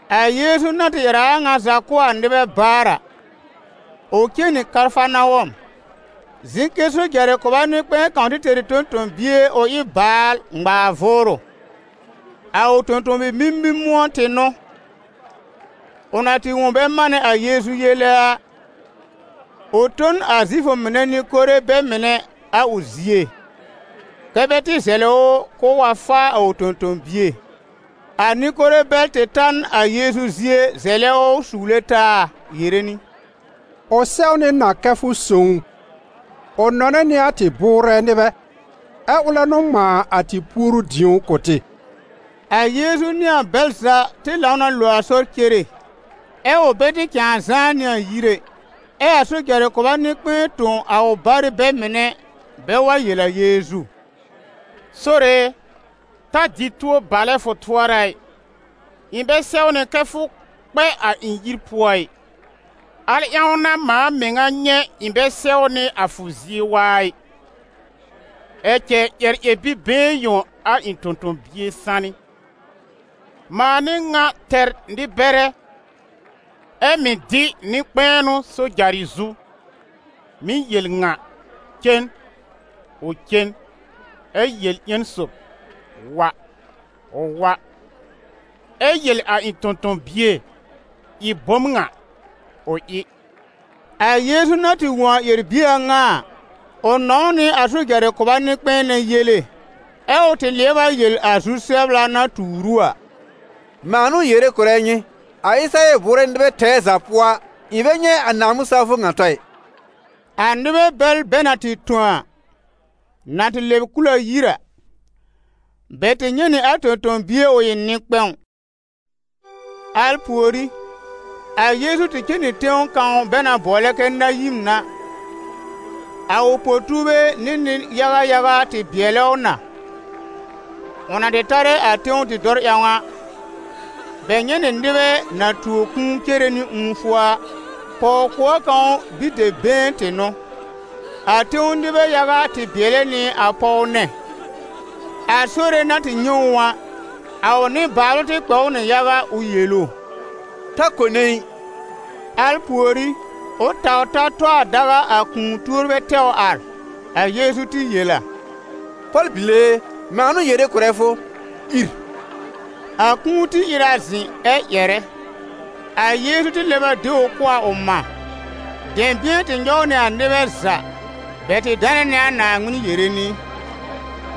A Yeezu na tɩ ƴɛr a a ŋa za kʋ̀ a nɩbɛ baar a, ʋ cen nɩ Kafarnawɔm. Zɩ̃ kɛ sojarɩ kʋba nɩ-kpɛ̃ɛ kãw tɩ tɛr ɩ tõ-tõ-bie ʋ ɩ baal ŋmaar vʋʋrʋ: a ʋ tõ-tõ-bi-mimi-mʋ̃ɔn tɩ n'ʋ. Ʋ na tɩ wõ bɛ manɛ a Yeezu yele a, ʋ tõ n a Zifʋ mɩnɛ nɩ-kore bɛ mɩnɛ a ʋ zie, kɛ́ bɛ tɩ zɛlɩ ʋ k'ʋʋ wa faa a ʋ tõ-tõ-bie. A nɩ-kore bɛl tɩ ta n a Yeezu zie zɛlɛ ʋ suwle taa yere nɩ: «Ʋ sɛwnɩ na kɛ fʋ sõw ʋ, ʋ nɔnɛ nɩ a tɩ bʋʋrɛ nɩbɛ, ɛ ʋlɛ n'ʋ ŋmãa a tɩ puoru-dĩo kʋ̀ tɩ.» A Yeezu nɩ a bɛl za tɩ lãw na lo a sɔr cere, ɛ ʋ bɛ tɩ cãa zãá nɩ a yir ɛ, ɛ a sojarɩ kʋba nɩ-kpɛ̃ɛ tõ a ʋ barɩ bɛ mɩnɛ bɛ wa yel a Yeezu: «Sore e, ta dɩ tuo balɛ fʋ tʋɔra ɩ, ɩ̃ bɛ sɛwnɩ kɛ fʋ kpɛ a ɩ̃ yir pʋɔ ɩ; al ƴãw n'a mãa mɩŋa nyɛ̃ ɩ̃ bɛ sɛwnɩ a fʋ zie waa ɩ, ɛ cɛ ƴɛr ƴɛr-bi-been yõ a ɩ̃ tõ-tõ-bie sanɩ. Mãa n'ɩ ŋa tɛr nɩ-bɛrɛ, ɛ mɩ̀ dɩ nɩ-kpɛ̃ɛnʋ sojarɩ zu, mɩ̀ yel ŋa: ‹Cen›, ʋ cen; ɛ yel ƴẽn sob: ‹Wa›, ʋ wa; ɛ yel a ɩ̃ tõ-tõ-bie: ‹Ɩ bom ŋa›, ʋ ɩ.» A Yeezu na tɩ wõ a ƴɛr-bie a ŋa a, ʋ nɔ̃w nɩ a sojarɩ kʋba nɩ-kpɛ̃ɛ nɛ yele; ɛ ʋ tɩ lɩɛb a yel a zu-sɛbla na tuur ʋ a: «Mãa n'ʋ yere kʋ̀rɛ nyɩ, a Ɩsɩrayɛl bʋʋrɛ nɩbɛ tɛɛ za pʋɔ a, ɩ̃ bɛ nyɛ̃ a Naaŋmɩn-sawfʋ ŋa tɔ ɩ.» A nɩbɛ bɛl bɛ na tɩ tõ a, na tɩ lɛb kul a yir a, bɛ tɩ nyɛ̃ nɩ a tõ-tõ-bie ʋ ɩ nɩ-kpɛ̃w. Al pùorí, a Yeezu tɩ cen nɩ tẽw kãw bɛ na bʋɔlɛ kɛ Nayin a. A ʋ po-tuurbɛ nɩ nɩ-yaga yaga tɩ bɩɛlɛ ʋ na. Ʋ na tɩ tarɛ a tẽw dɩ̃dɔr ƴãw a, bɛ nyɛ̃ nɩ nɩbɛ na tuo kũu cere nɩ ũufʋ a: pɔw-kʋɔr kãw bi-dɛb-been tɩ n'ʋ. A tẽw nɩbɛ yaga tɩ bɩɛlɛ nɩ a pɔw nɛ. A Sore na tɩ nyɛ̃ ʋ a, a ʋ nɩbaalʋ tɩ kpɛ̃ ʋ nɩ yaga ʋ yel ʋ: «Ta kone ɩ!» Al pùorí, ʋ taw ta tɔ a daga, a kũu-tuorbɛ tɛw ar. A Yeezu tɩ yel a: «Pɔl-bile e, mãa n'ʋ yere kʋ̀rɛ fʋ, ìr!» A kũu tɩ ìr a zɩ̃ ɛ ƴɛrɛ. A Yeezu tɩ lɛb a de ʋ kʋ̀ a ʋ mã. Dɛ̃bɩ̃ɛ tɩ nyɔw nɩ a nɩbɛ za. Bɛ tɩ danɛ nɩ a Naaŋmɩn yere nɩ: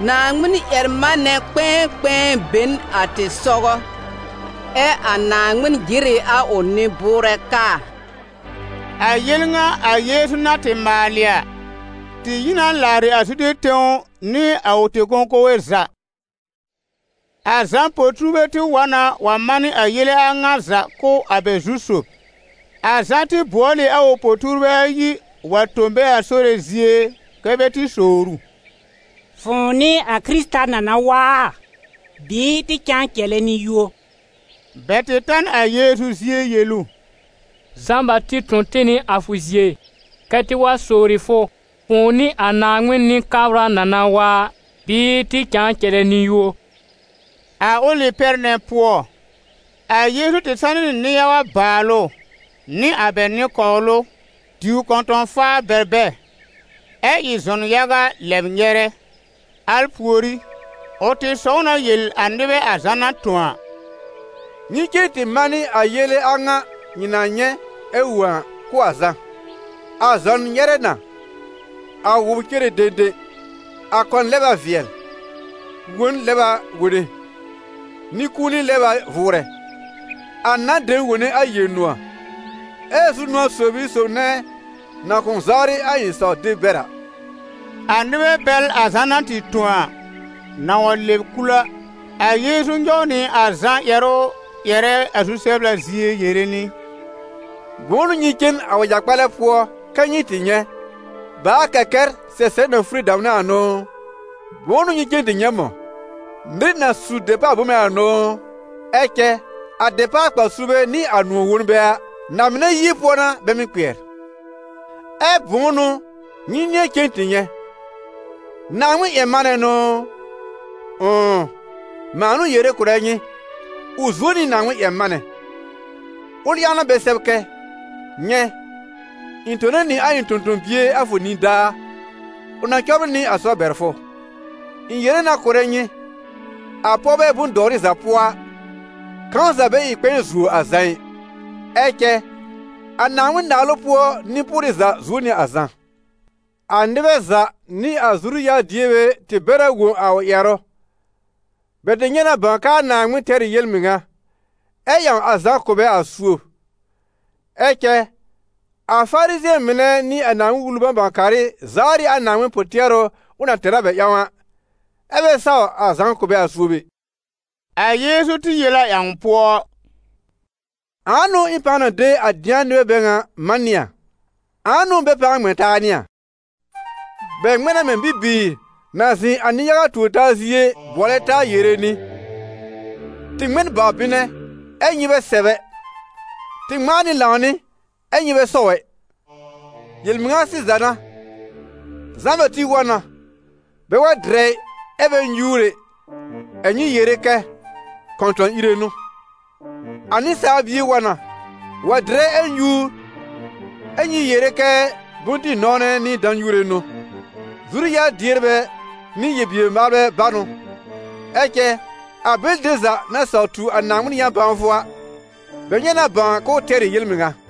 « Naaŋmɩn-ƴɛr-manɛ kpɛ̃ɛkpɛ̃ɛ be n a tɩ sɔgɔ, ɛ a Naaŋmɩn jɩr ɩ a ʋ nɩ-bʋʋrɛ kaa.» A Yel ŋa a Yeezu na tɩ maalɩ a, tɩ yi na làarɩ a Zude tẽw nɩ a ʋ tẽ-kõkowe za. A Zã po-tuurbɛ tɩ wa na wa manɩ a yele a ŋa za kʋ̀ a bɛ zu-sob. A Zã tɩ bʋɔl ɩ a ʋ po-tuurbɛ ayi wa tõ bɛ a Sore zie, kɛ́ bɛ tɩ sowr ʋ: «Fʋ̃ʋ n'ɩ a Kɩrɩta na na wa a, bɩɩ tɩ cãa cɛlɛ nɩ-yũo?» Bɛ tɩ ta n a Yeezu zie yel ʋ: «Zã-Bati tõ tɩ nɩ a fʋ zie, kɛ́ tɩ wa sowri fʋ: ‹ Fʋ̃ʋ n'ɩ a Naaŋmɩn Nɩ-kabra na na wa a, bɩɩ tɩ cãa cɛlɛ nɩ-yũo?›» A ʋlɩ pɛr nɛ pʋɔ, a Yeezu tɩ sanɩ nɩ nɩ-yaga bàalʋ nɩ a bɛ nɩ-kɔwlʋ, diw kɔ̃tɔ̃-faar bɛr bɛ, ɛ ɩ zɔn yaga lɛb nyɛrɛ. Al pùorí, ʋ tɩ sɔw na yel a nɩbɛ a Zã na tõ a: «Nyɩ cen tɩ manɩ a yele a ŋa nyɩ na nyɛ̃ ɛ wõ a kʋ̀ a Zã: a zɔn nyɛrɛ na, a wʋbr cere dẽdẽ, a kɔn lɛb a vɩɛl, wõn lɛb a wone, nɩ-kũuni lɛb a vʋʋrɛ, a nan dem wone a Yel-nʋ̃ɔ̀, ɛ zu-nʋ̃ɔ̀ sob n'ɩ a sob nɛ na kʋ̃ʋ zawrɩ a ɩ̃ saw-deb bɛr a.» A nɩbɛ bɛl a Zã na tɩ tõ a, na wa lɛb kul a, a Yeezu nyɔw nɩ a Zã ƴɛrʋ ƴɛrɛ a zu-sɛbla zie yere nɩ: «Bʋ̃ʋ n'ʋ nyɩ cen a wɛja-kpalɛ pʋɔ kɛ́ nyɩ tɩ nyɛ̃? Bàa-kɛkɛr sɛsɛb na fure damnɛ a n'ʋ ʋ? Bʋ̃ʋ n'ʋ nyɩ cen tɩ nyɛ̃ mɔ̃? Nɩr na su dɛpaal-bome a n'ʋ ʋ? Ɛ cɛ a dɛpaal-kpar-suurbɛ nɩ a nʋ̃ɔ̀-wonbɛ a, na-mɩnɛ yie pʋɔ n'a bɛ mɩ́ kpɩɛr. Ɛ bʋ̃ʋ n'ʋ nyɩ nɩ̃ɛ cen tɩ nyɛ̃? Naaŋmɩn-ƴɛr-manɛ n'ʋ ʋ? Ʋ̃ʋ, mãa n'ʋ yere kʋ̀rɛ nyɩ, ʋ zuo nɩ Naaŋmɩn-ƴɛr-manɛ. Ʋl ƴãw n'a bɛ sɛb kɛ: ‹Nyɛ̃, ɩ̃ tone nɩ a ɩ̃ tõ-tõ-bie a fʋ nidaa, ʋ na cɔbrɩ nɩ a sɔr bɛr fʋ.›» «Ɩ̃ yere na kʋ̀rɛ nyɩ, a pɔwbɛ bʋ̃-dɔwrɩ za pʋɔ a, kãw za bɛ ɩ kpɛ̃ɛ zuo a Zã ɩ, ɛ cɛ a Naaŋmɩn-Naalʋ pʋɔ nɩ-pʋrɩ za zuo nɩ a Zã. A nɩbɛ za nɩ a zuru-yar-dierbɛ tɩ bɛr a wõ a ʋ ƴɛrʋ, bɛ tɩ nyɛ̃ na bãw kɛ a Naaŋmɩn tɛr ɩ yel-mɩŋa, ɛ́ ƴãw a Zã kʋ̀ bɛ a suob. Ɛ cɛ a Farizɩ̃ɛ mɩnɛ nɩ a Naaŋmɩn-Wulu bãw-bãw-karɩ zawr ɩ a Naaŋmɩn pʋ-tɩɛrʋ ʋ na tɛr a bɛ ƴãw a, ɛ́ bɛ saw a Zã kʋ̀ bɛ a suob ɛ.» A Yeezu tɩ yel a ƴãw pʋɔ: «Ãa n'ʋ ɩ̃ pãa na de a dɩ̃a nɩbɛ bɛ ŋa man nɩ a? Ãa n'ʋ bɛ pãa ŋmɛ̃ taa nɩ a? Bɛ ŋmɛ̃ na mɛ̃ bibiir na zɩ̃ a nɩ- yaga tuor-taa zie bʋɔlɛ taa yere nɩ: ‹Tɩ ŋmɛ n bawr-bɩnɛ, ɛ́ nyɩ bɛ sɛ̀b ɛ; tɩ ŋmãa nɩ lãwnɩ, ɛ́ nyɩ bɛ sɔw ɛ!› Yel-mɩŋa sɩza n'a, Zã-Bati wa na, bɛ wa dɩrɛ ɩ, ɛ bɛ nyúur ɛ, ɛ nyɩ yere kɛ: ‹Kɔ̃tɔ̃-ire n'ʋ.› A Nɩsaal Bie wa na, wa dɩrɛ ɛ nyúur, ɛ nyɩ yere kɛ: ‹Bʋ̃-dɩ-nɔ̃wnɛ nɩ dã-nyuure n'ʋ, zuru-yar-dierbɛ nɩ yel-bier-maalbɛ bá n'ʋ.› Ɛ cɛ a bɛlɩ dem za na saw tu a Naaŋmɩn yã-bãwfʋ a, bɛ nyɛ̃ na bãw k'ʋʋ tɛr ɩ yel-mɩŋa.»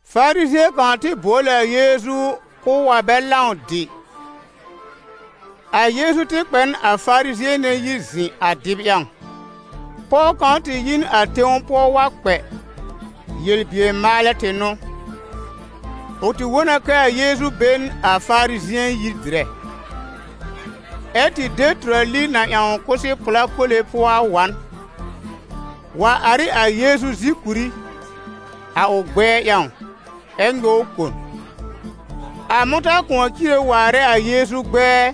Farizɩ̃ɛ kãw tɩ bʋɔl ɩ a Yeezu k'ʋʋ wa bɛ lãw dɩ. A Yeezu tɩ kpɛ n a Farizɩ̃ɛ nɛ yir zɩ̃ a dɩb ƴãw. Pɔw kãw tɩ yi n a tẽw pʋɔ wa kpɛ, yel-bier-maalɛ tɩ n'ʋ. Ʋ tɩ wõ na kɛ a Yeezu be n a Farizɩ̃ɛ yir dɩrɛ, ɛ́ tɩ de tʋrali na ƴãw kʋsɛ-pla kole pʋɔ a wa n, wa ar ɩ a Yeezu zìkùrí, a ʋ gbɛɛ ƴãw, ɛ́ nyɔw kon, a mʋ̃tã-kʋ̃ɔ cire waarɛ a Yeezu gbɛɛ,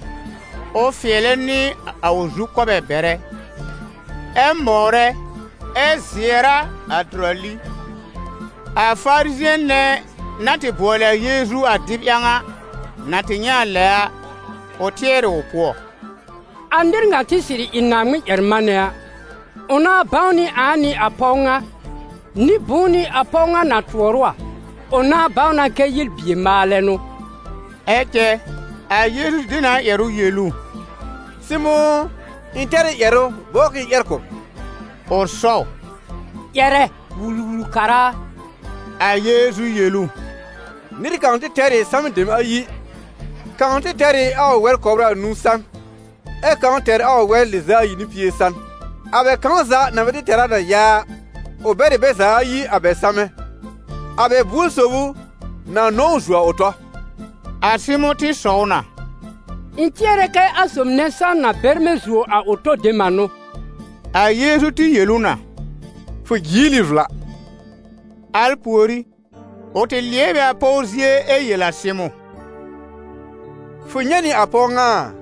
ʋ fɩɛlɛ nɩ a ʋ zukɔbɛ bɛrɛ, ɛ mɔwrɛ, ɛ zɩɛr a a tʋrali. A Farizɩ̃ɛ nɛ na tɩ bʋɔlɩ a Yeezu a dɩb ƴãw a, na tɩ nyɛ̃ a lɛ a, ʋ tɩɛr ɩ ʋ pʋɔ: «A nɩr ŋa tɩ sɩrɩ ɩ Naaŋmɩn-ƴɛr-manɛ a, ʋ nãá bãw nɩ ãa n'ɩ a pɔw ŋa, nɩ-bʋ̃ʋ n'ɩ a pɔw ŋa na tʋɔr ʋ a, ʋ nãá bãw na kɛ yel-bier-maalɛ n'ʋ.» Ɛ cɛ a Yeezu tɩ de nɩ a ƴɛrʋ yel ʋ: «Sɩmʋ̃ ʋ, ɩ̃ tɛr ɩ ƴɛrʋ bɔbr k'ɩ̃ɩ ƴɛr kʋ̀ b.» Ʋ sɔw: «Ƴɛrɛ, Wul-wul-kara a.» A Yeezu yel ʋ: «Nɩr kãw tɩ tɛr ɩ samɛ dem ayi. Kãw tɩ tɛr ɩ a ʋ wɛr kɔbr anũu san, ɛ kãw tɛr a ʋ wɛr lɩz'a ayi nɩ pie san. A bɛ kãw za na bɛ tɩ tɛr a na ya a, ʋ bɛr ɩ bɛ za ayi a bɛ sãmɛ. A bɛ buor sob n'ʋ na nɔ̃w ʋ zuo a ʋ tɔ?» A Sɩmʋ̃ tɩ sɔw na: «Ɩ̃ tɩɛrɛ kɛ a sob nɛ sãn na bɛrmɛ̃ zuo a ʋ tɔ dem a n'ʋ.» A Yeezu tɩ yel ʋ na: «Fʋ jiel ɩ vla.» Al pùorí, ʋ tɩ lɩɛb ɩ a pɔw zie ɛ yel a Sɩmʋ̃: «Fʋ nyɛ̃ nɩ a pɔw ŋa a?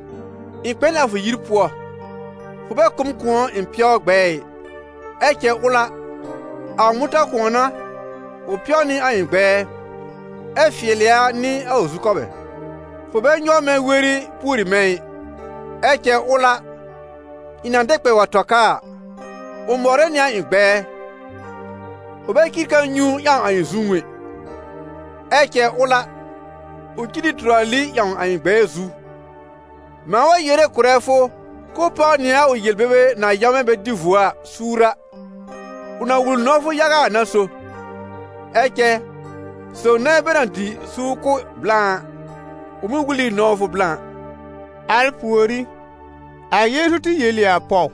Ɩ̃ kpɛ n a fʋ yir pʋɔ, fʋ bɛ kʋ̀ m kʋ̃ɔ ɩ̃ pɛw gbɛ̃ɛ ɩ; ɛ cɛ ʋl a, a ʋ mʋ̃tã-kʋ̃ɔ n'a ʋ pɛw nɩ a ɩ̃ gbɛɛ, ɛ fɩɛlɩ a nɩ a ʋ zukɔbɛ. Fʋ bɛ nyɔw mɛ̃ weri pùori mɛ̃ ɩ; ɛ cɛ ʋl a, ɩ̃ na dɛ kpɛ wa tɔ ka a, ʋ mɔwrɛ nɩ a ɩ̃ gbɛɛ. Fʋ bɛ cir kãa-nyũu ƴãw a ɩ̃ zũú ɛ; ɛ cɛ ʋl a, ʋ cir ɩ tʋrali ƴãw a ɩ̃ gbɛɛ zu. Mãa wa yere kʋ̀rɛ fʋ k'ʋʋ páw nɩ a ʋ yel-bebe na yãwmɛ bɛ dɩ vuo a, suur a, ʋ na wul nɔ̃wfʋ yaga a n'a so. Ɛ cɛ sob nɛ bɛ na mɩ́ dɩ suur kʋ̀ blã a, ʋ mɩ́ wul ɩ nɔ̃wfʋ blã.» Al pùorí, a Yeezu tɩ yel ɩ a pɔw: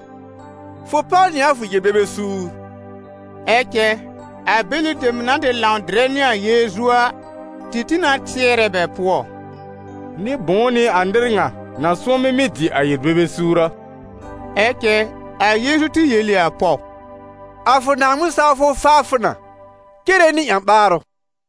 «Fʋ páw nɩ a fʋ yel-bebe suur.» Ɛ cɛ a bɛlɩ dem na tɩ lãw dɩrɛ nɩ a Yeezu a, tɩ tĩ na tɩɛrɛ bɛ pʋɔ: «Nɩ-bʋ̃ʋ n'ɩ a nɩr ŋa na sʋ̃ɔmɩ mɩ́ dɩ a yel-bebe suur a?» Ɛ cɛ a Yeezu tɩ yel ɩ a pɔw: «A fʋ Naaŋmɩn-sawfʋ faa fʋ na, cere nɩ ƴã-ɓaarʋ.»